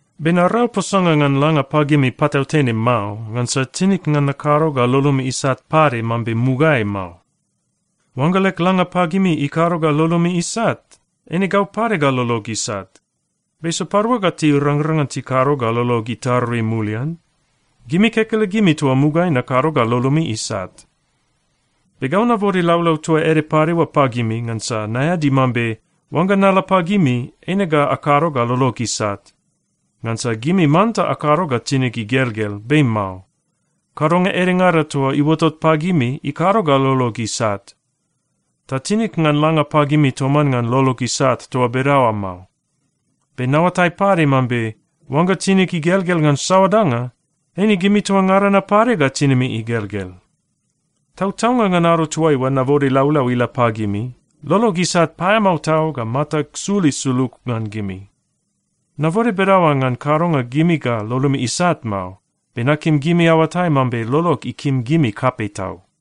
Be narau posanga ngan langa pagimi patautene mao, ngansa tinig ngan nakado ga lolomi isat pade mambe mugaeai mao. Oangga leg langa pagimi ikado ga lolomi isat, eine gau pade ga lolog isat. Be sapadua ga tirangrang ngan tikado ga lolog itarui mulian? Gimi kekelegimi toa mugaeai nakado ga lolomi isat. Be gau nabode laulau toa ede pade oa pagimi, ngansa naeadi mambe oangga nala pagimi, eine ga akado ga lolog isat. Ngansa gimi manta akado ga tinig igelgel, be mao. Kadonga edengada toa iuotot pagimi ikado ga lolog isat. Ta tinig ngan langa pagimi toman ngan lolog isat toa bedaoa mao. Be naoatai pade mambe oangga tinig igelgel ngan saoa danga, eine gimi toa ngada na pade ga tinimi igelgel. Tautaunga ngan ado toaiua nabode laulau ila pagimi, lolog isat paeamao tau ga matag sul isulug ngan gimi. Nabode bedaoa ngan kadonga gimi ga lolomi isat mao, be nakim gimi aoatai mambe lolog ikim gimi kapei tau.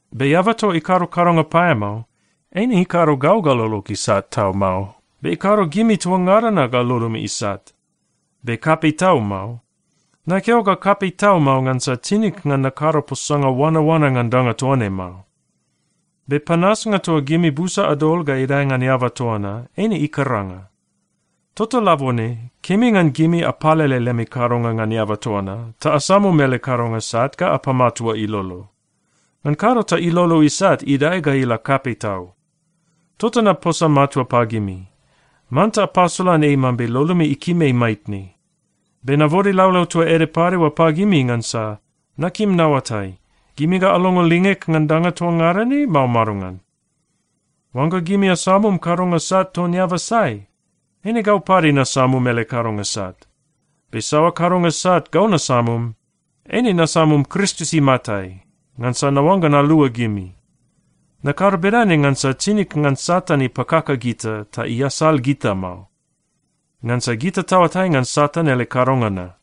Be eaba toa ikado kadonga paeamao, eine ikado gau ga lolog isat tau mao, be ikado gimi toa ngada na ga lolomi isat, be kapei tau mao. Nakeo ga kapei tau mao, ngansa tinig ngan nakado posanga oanaoana ngan danga toa ne mao. Be panasnga toa gimi busa adol ga idae ngan eaba toa na, eine ikaranga. Tota labone, kemi ngan gimi apalele lemi kadonga ngan eaba toa na, ta asamum ele kadonga sat ga apamatua ilolo. Ngan kado ta ilolo isat idae ga ila kapei tau. Tota naposa matua pagimi, manta apasolan ei mambe lolomi ikim ei maitne. Be nabode laulau toa ede pade oa pagimi ngansa nakim naoatai, gimi ga alongo lingeg ngan danga toa ngada ne, mao madongan. Oangga gimi asamum kadonga sat ton eaba sai, eine gau pade nasamum ele kadonga sat. Be saoa kadonga sat gau nasamum, eine nasamum Kristus imatai, ngansa naoangga nalua gimi. Nakado bedane ngansa tinig ngan Satan ipakaka gita ta iasal gita mao. Ngansa gita taoatai ngan Satan ele kadonga na.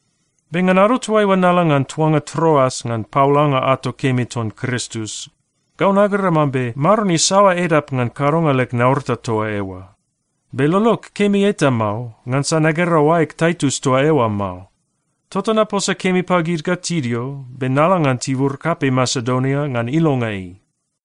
Be ngan ado toaiua nala ngan tuanga Troas ngan paolanga ato kemi ton Kristus, gau nagera mambe Maron isaoa edap ngan kadonga leg naurata toa eoa. Be lolog kemi eta mao, ngansa nagera oaeg Taitus toa eoa mao. Tota naposa kemi pagid ga tidio, be nala ngan tibur kapei Masedonia ngan ilonga ei.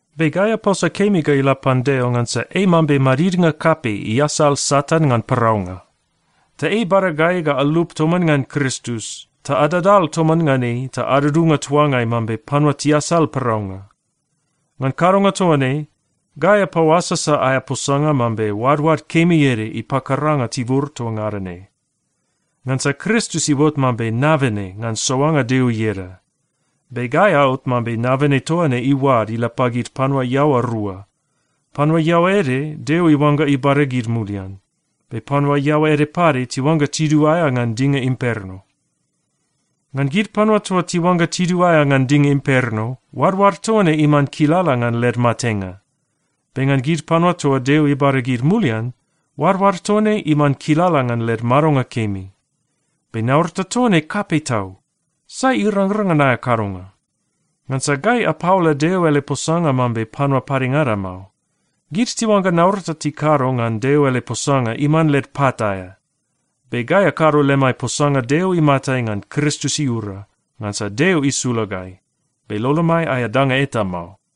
Be gai aposa kemi ga ila pan Deo ngansa ei mambe madidnga kapei iasal Satan ngan paraunga. Ta ei ibada gai ga alup toman ngan Kristus, ta adadal toman ngan ei ta adudunga tuangai mambe panua tiasal paraunga. Ngan kadonga toa ne, gai apaoasasa aea posanga mambe oadoad kemi ede ipakaranga tibur toa ngada ne. Ngansa Kristus iuot mambe nabene ngan soanga Deo ieda. Be gai aot mambe nabene toa ne iuad ila pagid panua iaoa rua. Panua iaoa ede, Deo iuangga ibada gid mulian, be panua iaoa ede pade tiuangga tiduaea ngan dinga imperno. Ngan gid panua toa tiuangga tiduaea ngan dinga imperno, oadoad toa ne iman kilala ngan led matenga. Be ngan gid panua toa Deo ibada gid mulian, oadoad toa ne iman kilala ngan led madonga kemi. Be naurata toa ne kapei tau. Sai irangrang ngan aea kadonga? Ngansa gai apaola Deo ele posanga mambe panua padengada mao. Gid tiuangga naurata tikado ngan Deo ele posanga iman led pat aea. Be gai akado lemai posanga Deo imatai ngan Kristus iura, ngansa Deo isula gai, be lolomai aea danga eta mao.